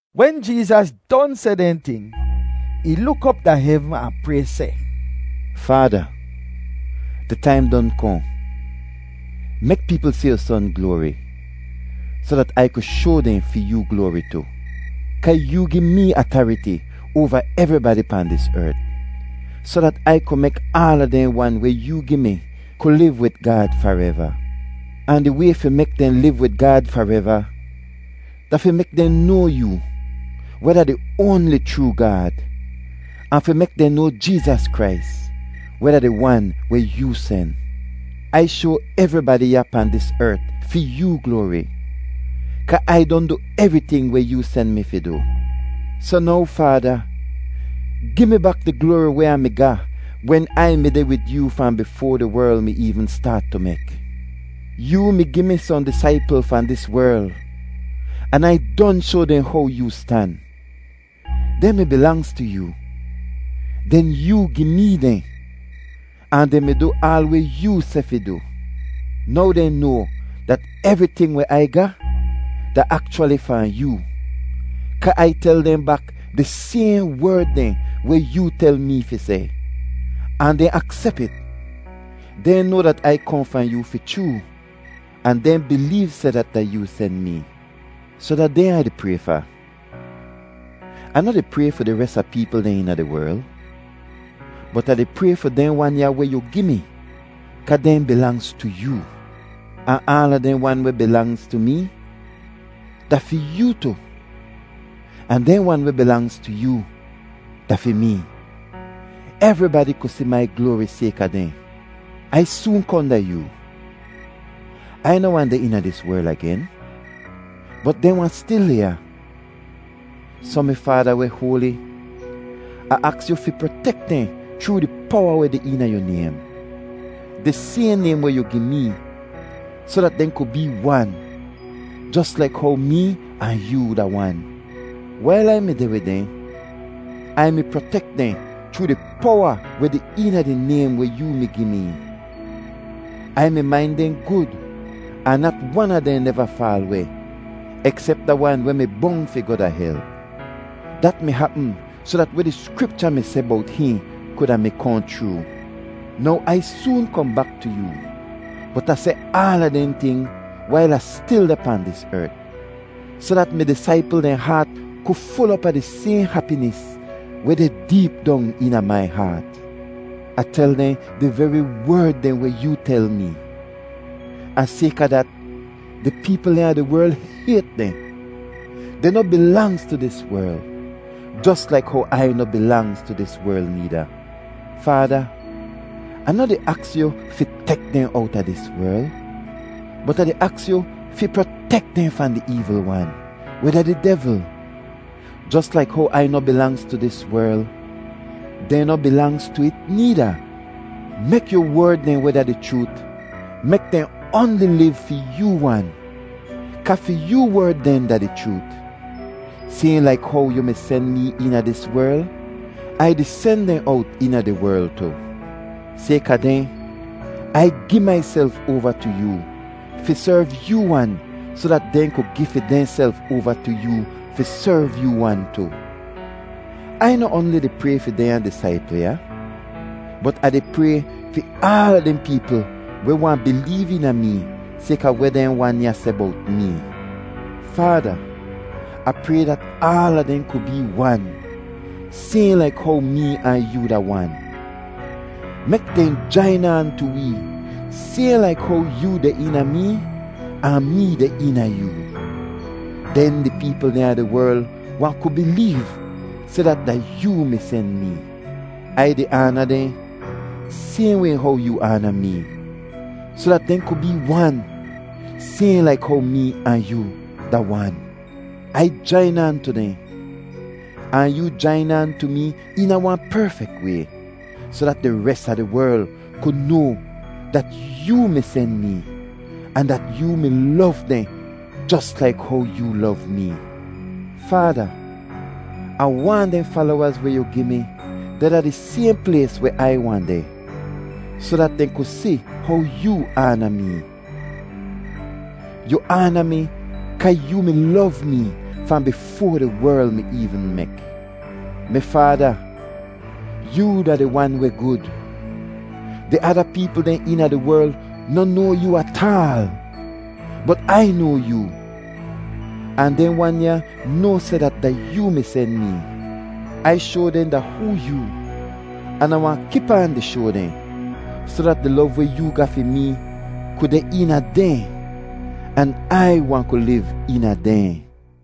Wen Jeezas don seh dehn ting, ih luk op da hevn ahn pray seh, “Faada, di taim don kohn. Mek peepl si yu Son gloari, soh dat Ai ku shoa dehn fi yoo gloari tu. Kaa yoo gi mee atariti oava evribadi pahn dis ert, soh dat Ai ku mek aala dehn wan weh yoo gi mi ku liv wid Gaad fareva. Ahn di way fi mek dehn liv wid Gaad fareva da fi mek dehn noa yoo, weh da di oanli chroo Gaad, ahn fi mek dehn noa Jeezas Krais, weh da di Wan weh yoo sen. Ai shoa evribadi ya pahn dis ert fi yoo gloari, kaa Ai don du evriting weh yoo sen mi fi du. Soh now Faada, gi mi bak di gloari weh Ah mi ga wen Ai mi deh wid yoo fahn bifoa di werl mi eevn staat tu mek. “Yoo mi gi mi sohn disaipl fahn dis werl an Ai don shoa dehn how yoo stan. Dehn mi bilangz tu yoo; den yoo gi mee dehn, ahn dehn mi du aal weh yoo seh fi du. Now dehn noa dat evriting weh Ai ga, da akchwali fahn yoo, kaa Ai tel dehn bak di sayhn werd dehn weh yoo tel mee fi seh, ahn dehn aksep it. Dehn noa dat Ai kohn fahn yoo fi chroo, ahn dehn bileev seh dat da yoo sen mee. Soh da dehn Ah di pray fa. Ah noh di pray fi di res a peepl dehn eena di werl, bot Ah di pray fi dehn wan ya weh yu gi mi kaa dehn bilangz tu yoo. Ahn aala dehn wan weh bilangz tu mee da fi yoo tu, ahn dehn wan weh bilangz tu yoo da fi mee. Evribadi ku si mai gloari sayka dehn. “Ai soon kohn da yoo; Ai noh wahn deh eena dis werl agen, bot dehn wahn stil deh ya. Soh mi Faada weh hoali, Ah aks yu fi protek dehn chroo di powa weh deh eena yu naym, di sayhn naym weh yu gi mee, soh dat dehn ku bee wan jos laik how mee ahn yoo da wan. Wail Ai mi deh wid dehn, Ai mi protek dehn chroo di powa weh deh eena di naym weh yoo mi gi mee. Ai mi main dehn gud ahn nat wan a dehn neva faal weh, eksep da wan weh mi bong fi goh da hel. Dat mi hapm soh dat weh di Skripcha mi seh bowt hihn kuda mi kohn chroo. “Now Ai soon kohn bak tu yoo, bot Ah seh aala dehn ting wail Ah stil deh pahn dis ert, soh dat mi disaipl dehn haat ku ful op a di sayhn hapinis weh deh deep dong eena mai haat. Ah tel dehn di veri werd dehn weh yoo tel mee, ahn sayka dat, di peepl dehn a di werl hayt dehn. Dehn noh bilangz tu dis werl, jos laik how Ai noh bilangz tu dis werl needa. Faada, Ah noh di aks yu fi tek dehn owta dis werl, bot Ah di aks yu fi protek dehn fahn di eevl wan, weh da di devl. Jos laik how Ai noh bilangz tu dis werl, dehn noh bilangz tu it needa. Mek yu werd dehn weh da di chroot mek dehn oanli liv fi yoo wan, kaa fi yoo werd dehn da di chroot. Sayhn laik how yu mi sen mee eena dis werl, Ai di sen dehn owt eena di werl tu. Sayka dehn, Ai gi maiself oava tu yoo fi serv yoo wan soh dat dehn ku gi fi dehnself oava tu yoo fi serv yoo wan tu. “Ai noh oanli di pray fi dehnya disaipl ya, bot Ah di pray fi aala dehn peepl weh wahn bileev eena mee sayka weh dehn wan ya seh bowt mee. Faada, Ah pray dat aala dehn ku bee wan sayhn laik how mee ahn yoo da wan. Mek dehn jain aan tu wee sayhn laik how yoo deh eena mee ahn mee deh eena yoo. Den di peepl dehn a di werl wahn ku bileev seh dat da yoo mi sen mee. Ai di aana dehn sayhn way how yoo aana mee, soh dat dehn ku bee wan sayhn laik how mee ahn yoo da wan. Ai jain aan tu dehn ahn yoo jain aan tu mee eena wahn perfek way, soh dat di res a di werl ku noa dat yoo mi sen mee, ahn dat yoo mi lov dehn jos laik how yoo lov mee. “Faada, Ah waahn dehn falowaz weh yu gi mi deh da di sayhn plays weh Ai wahn deh, soh dat dehn ku si how yoo aana mee. Yu aana mi kaa yoo mi lov mee fahn bifoa di werl mi eevn mek. “Mi Faada, yoo da di Wan weh gud. Di ada peepl dehn eena di werl noh noa yoo ataal, bot Ai noa yoo, ahn dehn wan ya noa seh dat da yoo mi sen mee. Ai shoa dehn da hoo yoo an Ah wahn kip aan di shoa dehn, soh dat di lov weh yoo ga fi mee ku deh eena dehn, an Ai wahn ku liv eena dehn.”